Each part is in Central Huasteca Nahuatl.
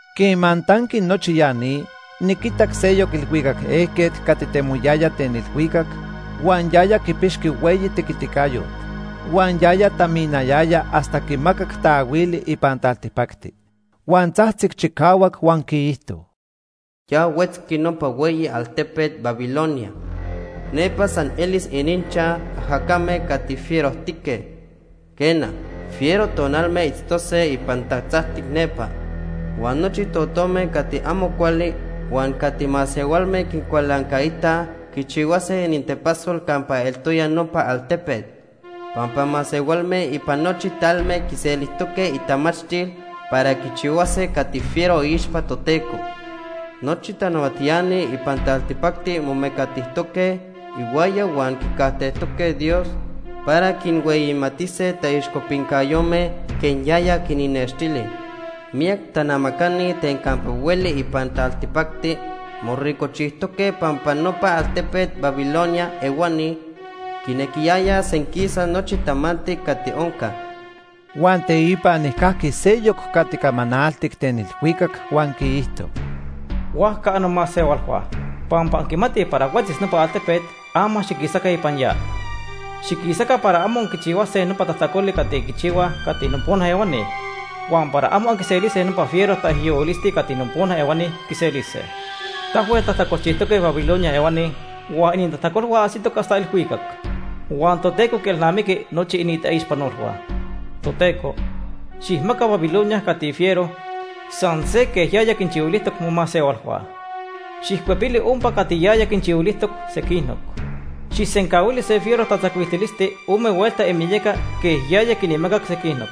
Quema tanqui nochi ya ni, niquitac seyoc ilhuicac ejquet cati temoyaya ten ilhuicac, huan yaya quipixqui hueyi tequiticayot. Huan yaya taminayaya hasta quimacac taahuili ipan taltipacti. Huan tzajtzic chicahuac huan quiijto: “Ya huetzqui nopa hueyi altepet Babilonia. Nepa san elis ininchaj ajacame cati fierojtique. Quena, fiero tonalme itztose ipan tatzacti nepa. Huan nochi totome cati amo cuali huan cati masehualme quincualancaitaj quichihuase inintepasol campa eltoya nopa altepet. Pampa masehualme ipan nochi talme quiselijtoque itamachtil para quichihuase cati fiero iixpa Toteco. Nochi tanahuatiani ipan taltipacti momecatijtoque ihuaya huan quicajtejtoque Dios para quinhueyimatise taixcopincayome quej yaya quinnextili. Miyac tanamacani ten campa hueli ipan taltipacti moricojchijtoque pampa nopa altepet Babilonia ehuani quinequiyayaj senquisa nochi tamanti cati onca.” Huan teipa nijcajqui seyoc cati camanaltic ten ilhuicac huan quiijto: “Huajca annomasehualhua, pampa anquimatij para huetzis nopa altepet, ama xiquisaca ipan ya. Xiquisaca para amo anquichihuase nopa tajtacoli cati quichihuaj cati nopona ehuani, huan para amo anquiselise nopa fiero taijyohuilisti cati nopona ehuani quiselise. Tahuel tajtacolchijtoque Babilonia ehuani huan inintajtacolhua ajsitoc hasta ilhuicac. Huan Toteco quielnamiqui nochi inintaixpanolhua. Toteco, xijmaca Babilonia cati fiero, san se quej yaya quinchihuilijtoc momasehualhua. Xijcuepili ompa cati yaya quinchihuilijtoc sequinoc. Xijsencahuili se fiero tatzacuiltilisti ome huelta imiyaca quej yaya quinmacac sequinoc.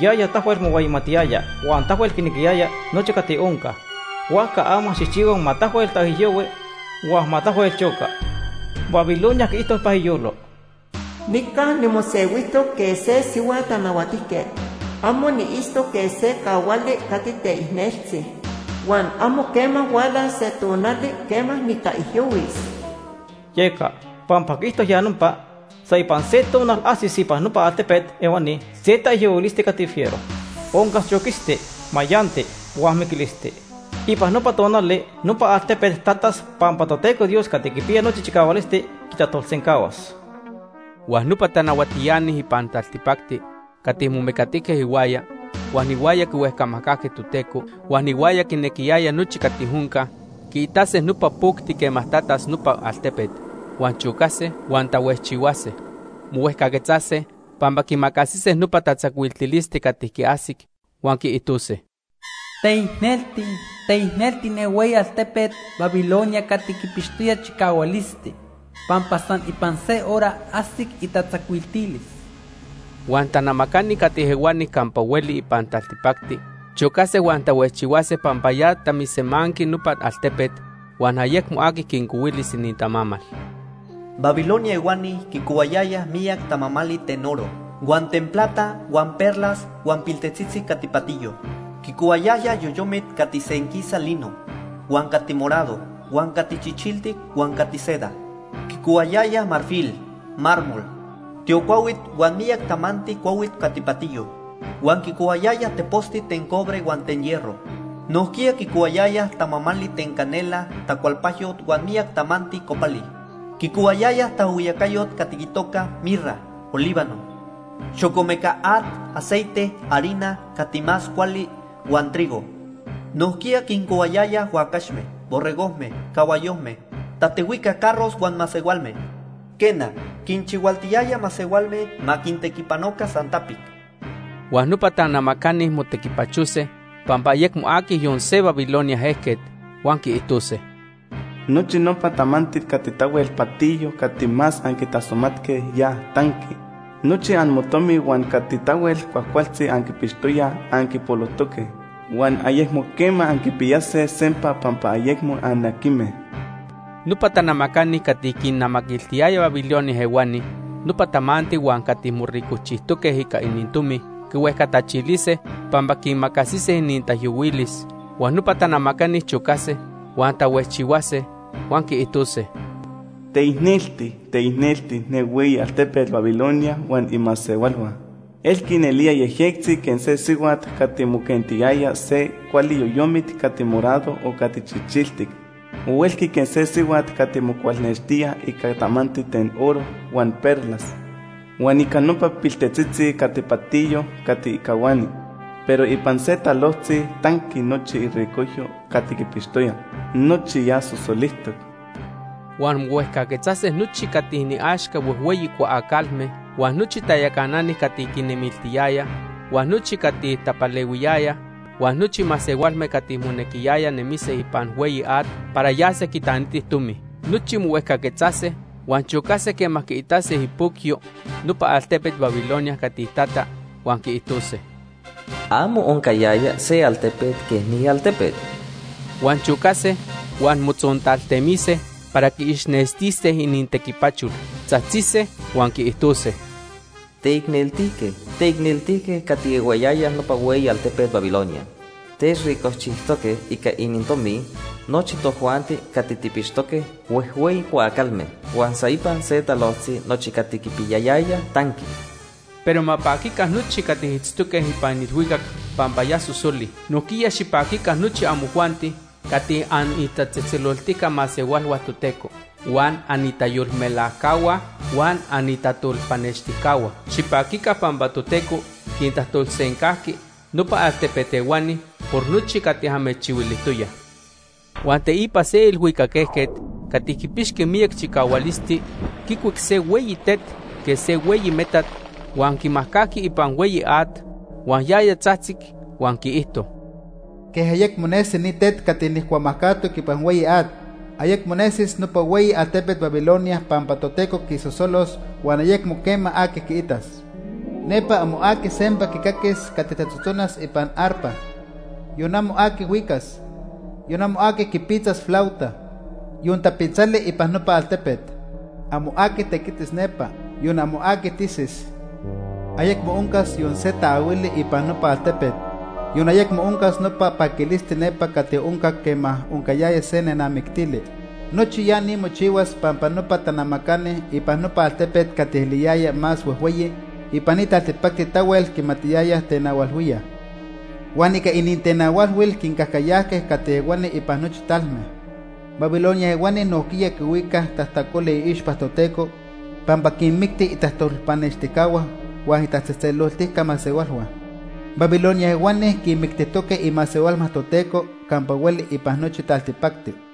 Yaya tahuel mohueyimatiyaya huan tahuel quinequiyaya nochi cati onca, huajca ama xijchihua ma tahuel taijyohui huan ma tahuel choca. Babilonia quiijto ipan iyolo: ‘Nica nimosehuijtoc quej se sihua tanahuatijquet. Amo niitztoc quej se cahuali cati teicneltzi. Huan amo quema hualas se tonali quema nitaijyohuis.’ Yeca, pampa quiijto ya nopa, san ipan se tonal ajsis ipan nopa altepet ehuani se taijyohuilisti cati fiero. Oncas choquisti, mayanti huan miquilisti. Ipan nopa tonali nopa altepet tatas pampa Toteco Dios Cati Quipiya Nochi Chicahualisti quitajtolsencahuas.” Huan nopa tanahuatiani ipan taltipacti cati momecatijque ihuaya, huan ihuaya quihuejcamajcajque Toteco, huan ihuaya quinequiyayaj nochi cati onca, quiitase nopa pocti quema tatas nopa altepet, huan chocase, huan tahuejchihuase. Mohuejcaquetzase pampa quiimacasise nopa tatzacuiltilisti cati quiajsic, huan quiijtose: “¡Teicnelti, teicnelti ne hueyi altepet Babilonia cati quipixtoya chicahualisti! ¡Pampa san ipan se hora ajsic itatzacuiltilis!” Huan tanamacani cati ehuani campa hueli ipan taltipacti chocase huan tahuejchihuase pampa ya tamisemanqui nopa altepet huan ayecmo aqui quincohuilis inintamamal. Babilonia ehuani quicohuayayaj miyac tamamali ten oro, huan ten plata, huan perlas huan piltetzitzi cati patiyo. Quicohuayayaj yoyomit cati senquisa lino, huan cati morado, huan cati chichiltic huan cati seda. Quicohuayayaj marfil, mármol, tiocuahuit huan miyac tamanti cuahuit cati patiyo. Huan quicohuayayaj teposti ten cobre huan ten hierro. Nojquiya quicohuayayaj tamamali ten canela, tacualpajyot huan miyac tamanti copali. Quicohuayayaj taajhuiyacayot cati itoca mirra, olíbano, xocomeca at, aceite, harina cati más cuali, huan trigo. Nojquiya quincohuayayaj huacaxme, borregojme, cahuayojme, tatehuijca carros huan masehualme. Quena, quinchihualtiyayaj masehualme ma quintequipanoca san tapic. Huan nopa tanamacani motequipachose pampa ayecmo aqui yon se Babilonia ejquet. Huan quiijtose: “Nochi nopa tamanti cati tahuel patiyo cati más anquitasomatque, ya tanqui. Nochi amotomi huan cati tahuel cuajcualtzi anquipixtoyaj, anquipolojtoque huan ayecmo quema anquipiyase sempa pampa ayecmo anaquijme.” Nopa tanamacani cati quinnamaquiltiyayaj Babilonia ehuani nopa tamanti huan cati moricojchijtoque ica inintomi, quihuejcatachilise pampa quiimacasise inintaijyohuilis. Huan nopa tanamacani chocase huan tahuejchihuase, huan quiijtose: “¡Teicnelti, teicnelti ne hueyi altepet Babilonia huan imasehualhua! Elqui nelía yejyectzi quej se sihuat cati moquentiyaya se cuali yoyomit cati morado o cati chichiltic. O elqui quej se sihuat cati mocualnextía ica tamanti ten oro, huan perlas, huan ica nopa piltetzitzi cati patiyo cati cahuani. Pero ipan se talojtzi ya tanqui nochi iricojyo cati quipixtoya. ¡Nochi ya sosolijtoc!” Huan mohuejcaquetzase nochi cati iniaxca huejhueyi cuaacalme, huan nochi tayacanani cati quinnemiltiyayaj, huan nochi cati tapalehuiyayaj, huan nochi masehualme cati monequiyaya nemise ipan hueyi at para yase quitanitij tomi. Nochi mohuejcaquetzase huan chocase quema quiitase ipocyo nopa altepet Babilonia cati tata huan quiijtose: “Amo oncayaya se altepet quej ni altepet.” Huan chocase huan motzontaltemise para quiixnextise inintequipachol. Tzajtzise huan quiijtose: “¡Teicneltique, teicneltique cati ehuayaya nopa hueyi altepet Babilonia! Techricojchijtoque ica inintomi nochi tojuanti cati tijpixtoque huejhueyi cuaacalme, huan san ipan se talojtzi nochi cati quipiyayayaj tanqui.” Pero ma paquica nochi cati itztoque ipan ilhuicac pampa ya sosoli. Nojquiya xipaquica nochi amojuanti cati anitatzejtzeloltica masehualhua Toteco, huan anitayolmelajcahua huan anitajtolpanextijcahua. Xipaquica pampa Toteco quintajtolsencajqui nopa altepet ehuani por nochi cati amechchihuilijtoyaj. Huan teipa se ilhuicac ejquet cati quipixqui miyac chicahualisti quicuic se hueyi tet quej se hueyi metat huan quimajcajqui ipan hueyi at. Huan yaya tzajtzic huan quiijto: “Quej ayecmo nesi ni tet cati nijcuamajcajtoc ipan hueyi at, ayecmo nesis nopa hueyi altepet Babilonia pampa Toteco quisosolos huan ayecmo quema aqui quiitas. Nepa amo aqui sempa quicaquis cati tatzotzonas ipan arpa. Yon amo aqui huicas, yon amo aqui quipitzas flauta, yon tapitzali ipan nopa altepet. Amo aqui tequitis nepa, yon amo aqui tisis. Ayecmo oncas yon se taahuili ipan nopa altepet, yon ayecmo oncas nopa paquilisti nepa cati oncac quema oncayaya se nenamictili. Nochi ya ni mochihuas pampa nopa tanamacani ipan nopa altepet cati eliyayaj más huejhueyi ipan taltipacti tahuel quimatiyayaj tenahualhuíaj. Huan ica inintenahualhuil quincajcayajque cati ehuani ipan nochi talme.” Babilonia ehuani nojquiya quihuicaj tajtacoli iixpa Toteco pampa quinmicti itajtolpanextijcahua huan itatzejtzeloltica masehualhua. Babilonia ehuani quinmictijtoque imasehualhua Toteco campa hueli ipan nochi taltipacti.